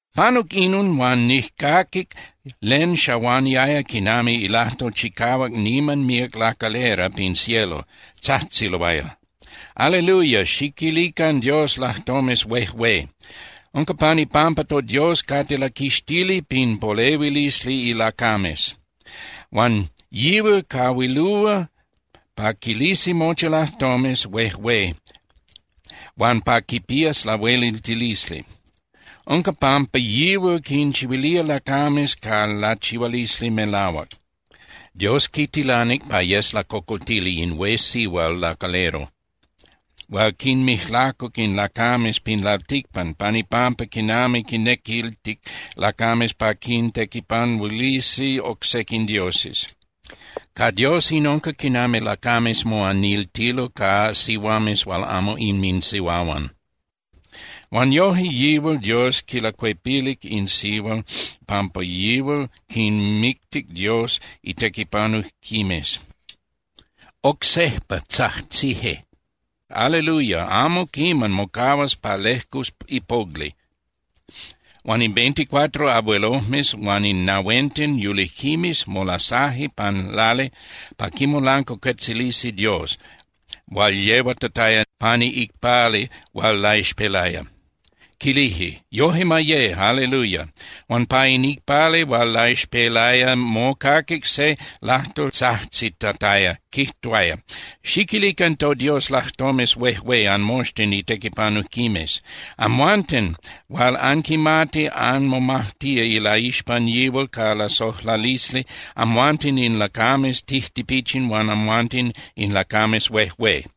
Panuc inon huan nijcaquic len xahuaniaya quinami ilajtol chicahuac niman míac lacalera pin cielo, tzajtziloaya: ¡Aleluya, xiquilican Dios lajtomes huejué! Unca pan ipampa toDios cate laquixtili pin polehuilisli ilacames. Huan yihual cahuilúa pa quilisi mochi lajtomes huejué huan pa quipías lahueliltilisli. Unca pampa yihual quinchihuilía lacames ca lachihualisli melahuac. Dios quitilanic pa yes lacocoltili in hué sihual lacalero hual quinmijlacuc in lacames pin lalticpan pan ipampa quinami quinnequiltic lacames pa quintequipanuilisi oc sequin dioses. Ca Dios in unca quinami lacames moaniltilo ca sihuames hual amo inminsihuahuan. Huan yojque yihual Dios quilacuepilic in sihual pampa yihual quinmictic Dios itequipanujquimes. Oc sejpa tzajtzije: —¡Aleluya! Amo quiman mocahuas pa lejcus ipogli. Huan in veinticuatro abuelojmes huan in nahuenten yulijquimes molasaje pan lali pa quimolancuacuetzilisi Dios hual yehuatataya pani iicpali hual laixpelaya, quilije: —¡Yoje ma ye! ¡Aleluya! Huan pa in icpali hual laixpelaya mocaquic se lajtol tzajtzitataya, quijtuaya: Xiquilican toDios lajtomes huejué, anmoxtin itequipanujquimes, amhuanten hual anquimati anmomajtía ilaixpan yihual ca lasojlalisli, amhuanten in lacames tijtipichin, huan amhuanten in lacames huejué.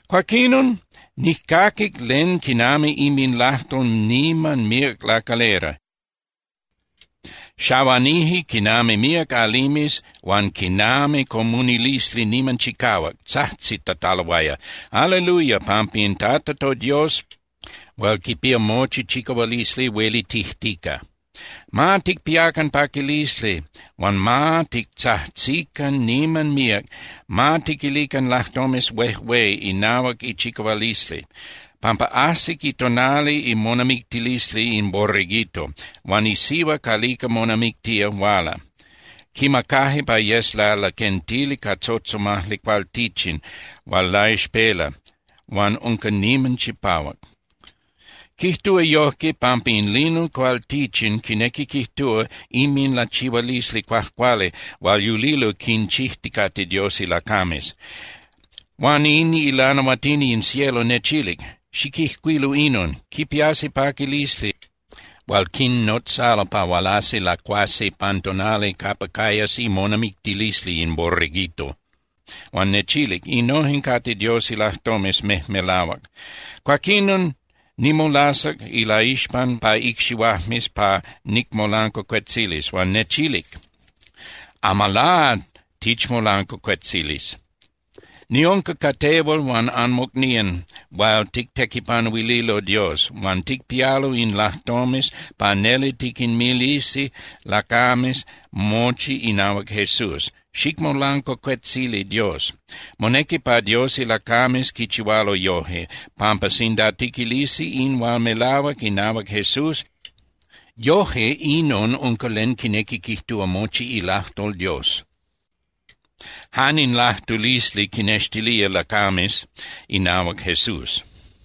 Cuaquinon nijcaquic len quinami inminlajtol niman míac lacalera, xahuanije quinami míac alimes huan quinami comunilisli niman chicahuac, tzajtzitataloaya: ¡Aleluya! pampa in Tata toDios hual quipía mochi chicahualisli huelitijtica. Ma ticpiacan paquilisli huan ma titzajtzican niman míac, ma tiquilican lajtomes huejué inahuac ichicahualisli, pampa ajsic itonali imonamictilisli in Borreguito, huan isihua calica monamictía huala. Quimacaje pa yes lalaquentili ca tzotzomajli cualtichin, hual laixpela huan unca niman chipahuac. Quijtúa yojque, pampa in lino cualtichin quinequi quijtúa inminlachihualisli cuajcuali hual yulilo quinchijticate Dios ilacames. Huan in ilanahuatini in cielo nechilic: —Xiquijcuilu inon: “Quipiasi paquilisli hual quinnotzalo pa hualasi lacuasi pan tonali capa cayas imonamictilisli in Borreguito.” Huan nechilic: —Innojen cate Dios ilajtomes mejmelahuac. Cuaquinon nimolasac ilaixpan pa icxihuajmes pa nicmolancuacuetzilis. Huan nechilic: —Amalá tichmolancuacuetzilis. Niunca ca tehual huan anmocnían hual tictequipanuililo Dios huan ticpialo in lajtomes pa neli tiquinmilisi lacames mochi inahuac Jesús. Xicmolancuacuetzili Dios. Monequi pa Dios ilacames quichihualo yojque, pampa sinda tiquilisi in hual melahuac inahuac Jesús, yoje inon unca len quinequi quijtúa mochi ilajtol Dios, jan in lajtulisli quinextilía lacames inahuac Jesús.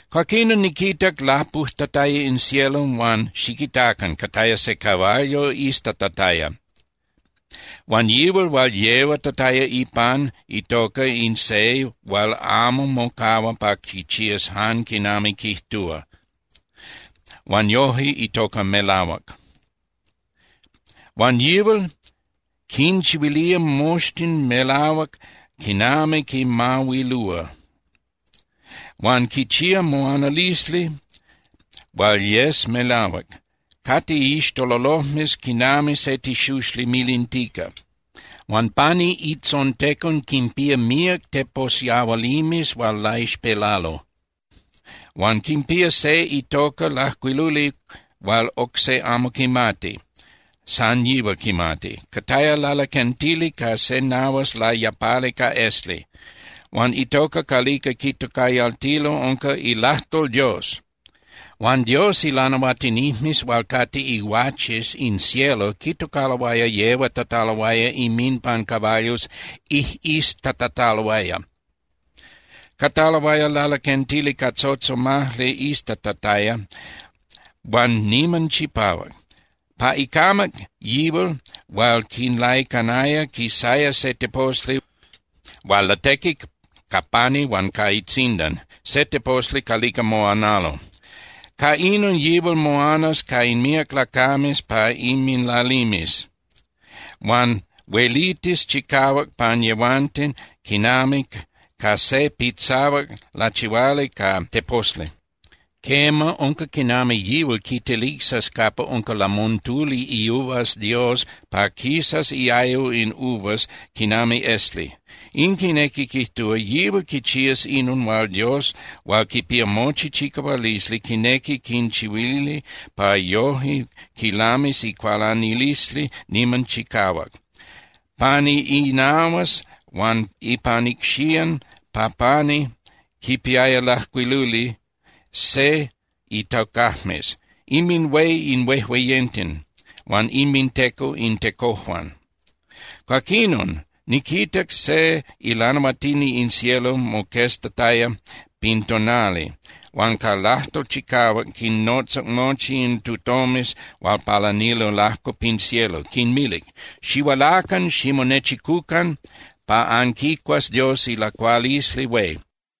Cuaquinon niquitac lapujtataya in cielo, huan ¡xiquitacan! Cataya se caballo iztatataya. Huan yihual hual yehuatataya ipan itoca in Se Hual Amo Mocahua pa Quichías Jan Quinami Quijtúa, huan noje itoca Melahuac. Huan yihual quinchihuilía moxtin melahuac quinami quinmahuilúa. Huan quichía moanalisli hual yes melahuac. Cate iixtololojmes quinami se tixuxli milintica. Huan pani itzontecon quinpía míac teposyahualimes hual laixpelalo. Huan quipía se itoca lajcuiluli hual oc se amo quimati, san yihual quimati. Cataya lalaquentili ca se nahuas layapali ca esli. Huan itoca calica quitocayaltilo unca ILAJTOL DIOS. Huan Dios ilanahuatinijmes hual cate iguaches in cielo quitocaloaya yehuatataloaya inminpan caballos ijꞌiztatataloaya. Cataloaya lalaquentili ca tzotzomajli iztatataya huan niman chipahuac. Pa icamac yihual hual quinlaicanaya quisaya se teposli hual latequi ca pani huan ca itzindan, se teposli calica moanalo. Ca inon yihual moanas ca in míac lacames pa inminlalimes, huan huelitis chicahuac pan yehuanten quinami ca se pitzahuac lachihuali ca teposli. Quema, unca quinami yihual quitelicsas capa unca lamontuli iuvas Dios pa quisas iayo in uvas quinami esli. In quinequi quijtúa, yihual quichías inon hual Dios hual quipía mochi chicahualisli quinequi quinchihuili pa yoje quilamis icualanilisli niman chicahuac. Pani inahuas huan ipan icxían pa pani quipiaya lajcuiluli se itocajmes: “INMINHUÉ IN HUEJUEYENTEN HUAN INMINTECO IN TECOJUAN”. Cuaquinon niquitac se ilanahuatini in cielo moqueztataya pin tonali, huan ca lajtol chicahuac quinnotzac mochi in tutomes hual palanilo lajco pin cielo, quinmilic: —Xihualacan ximonechicucan pa anquicuas Dios ilacualisli hué.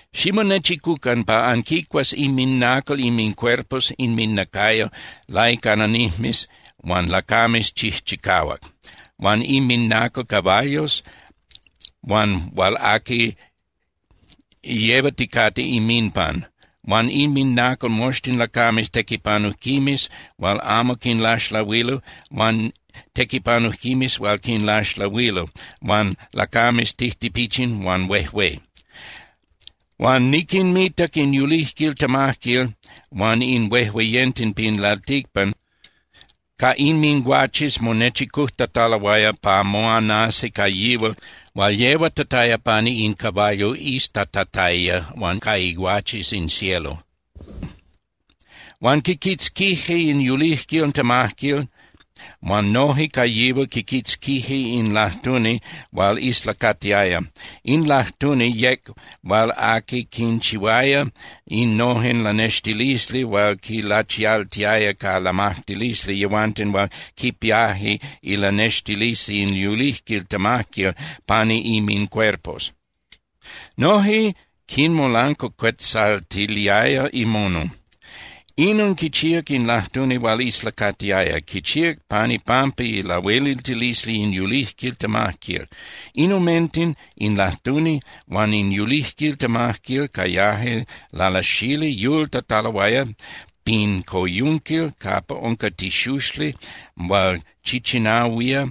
Ximonechicucan pa anquicuas inminacal inmincuerpos (inminacayo) laicananijmes huan lacames chijchicahuac, huan inminacal caballos huan hual aqui yehuaticate inminpan, huan inminacal moxtin lacames tequipanujquimes hual amo quinlaxlahuilo huan tequipanujquimes hual quinlaxlahuilo huan lacames tijtipichin huan huejué. Huan niquinmitac in yulijquil temajquil huan in huejueyenten pin lalticpan ca inminguaches monechicujtataloaya pa moanasi ca yihual hual yehuatataya pani in caballo iztatataya huan ca iguaches in cielo. Huan quiquitzquije in yulijquil temajquil huan noje ca yihual quiquitzquije in lajtuni hual islacatiaya. In lajtuni yec hual aqui quinchihuaya innojen lanextilisli hual quinlachialtiaya ca lamajtilisli yehuanten hual quipiaje ilanextilisli in yulijquil temajquil pani inmincuerpos. Noje quinmolancuacuetzaltiliaya imono. Inon quichíac in lajtuni hual islacatiaya, quichíac pan ipampa ilahueliltilisli in yulijquil temajquil. In omenten, in lajtuni huan in yulijquil temajquil cayaje lalasali yultataloaya pin coyunquil capa unca tixuxli hual chichinahuía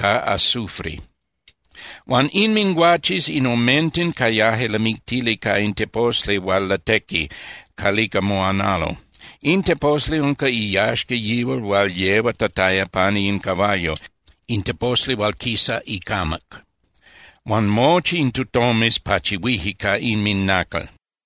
ca azufre. Huan inminguaches in omenten cayaje lamictili ca in teposli hual latequi calica moanalo. In teposli unca iyaxca yihual hual yehuatataya pani in caballo, in teposli hual quisa icamac. Huan mochi in tutomes pachihuije ca inminacal.